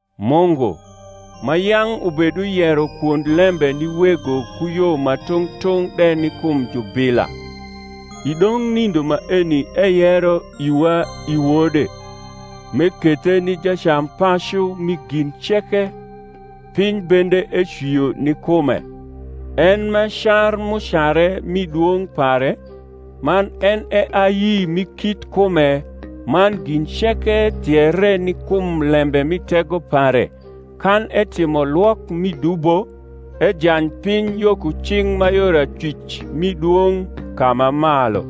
Mungu, ma yang’ ubeduyero kwond lembe ni wego ku yo ma tung’ tung’ de ni kum jubila, i dong’ nindo maeni eyero iwa i Wode, m’ekethe ni jacampacu mi gin ceke, piny bende ecwio ni kume; en m’e car m’ucare mi dwong’ pare, man en e ayi mi kit kume, man gin ceke thiere ni kum lembe mi tego pare, kan etimo lwok mi dubo, ejany piny yo ku cing’ ma yor acwic mi Dwong’ ka ma malu;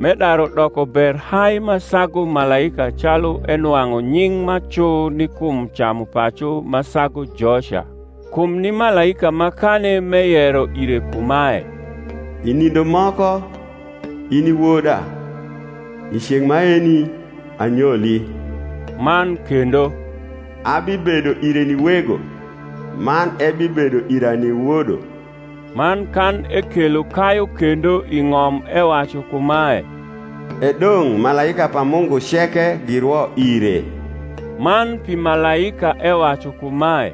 m’edaru doko ber hai ma sagu malaika calu enwang’u nying’ ma cu ni kum camupacu ma sagu joca. Kum ni malaika makani m’eyero ire kumae, i nindo moko, In i Woda, I ceng’ maeni anyoli? man kendo, Abibedo ire ni Wego, Man ebibedo ira ni Wodo? Man kan ekelo kayu kendo i ng’om ewacu kumae, E dong’ malaika pa Mungu ceke girwo ire. Man pi malaika ewacu kumae,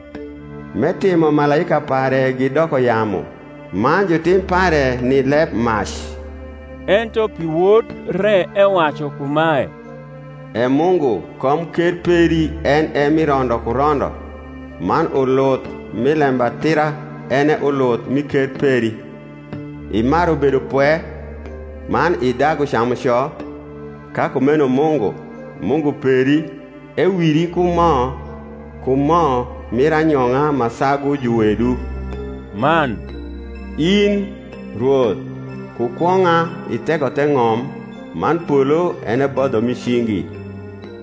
M’etimo malaika pare gidoko yamu, Man jutim pare ni lebmac; ento pi Wod re ewacu kumae, E Mungu, komker peri en e mi rondo ku rondo; Man uluth mi lembatira en e uluth mi ker peri. Imaru bedopwe, man idagu camuco; Ka kumeno Mungu, Mungu peri, ewiri ku mo Ku mo mir anyong’a ma sagu juwedu. Man, In, Rwoth, ku kwong’a itheko the ng’om, Man polo en e bodho mi chigi;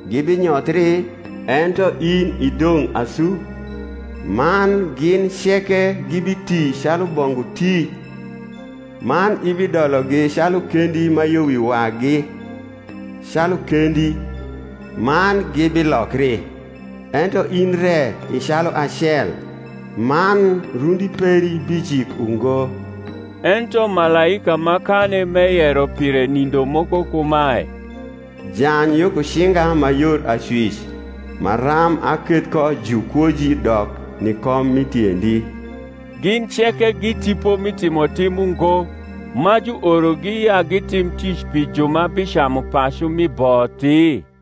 Gibinyothri; ento in idong’ asu: Man gin ceke gibiti calu bongu ti; Man ibidologi calu kendi ma yo wi wagi, Calu kendi, man gibilokri: Ento in re i cahi acel, Man rundi peri bijik ungo. Ento malaika makani m’eyero pire nindo moko kumae, Jany yo ku cinga ma yor acwic, Maram aketh ko jukwoji dok ni kom mi tiendi. Gin ceke gi tipo mi timotim ungo, ma juorogi ya gitim tic pi ju ma bicamu pacu mi bothi?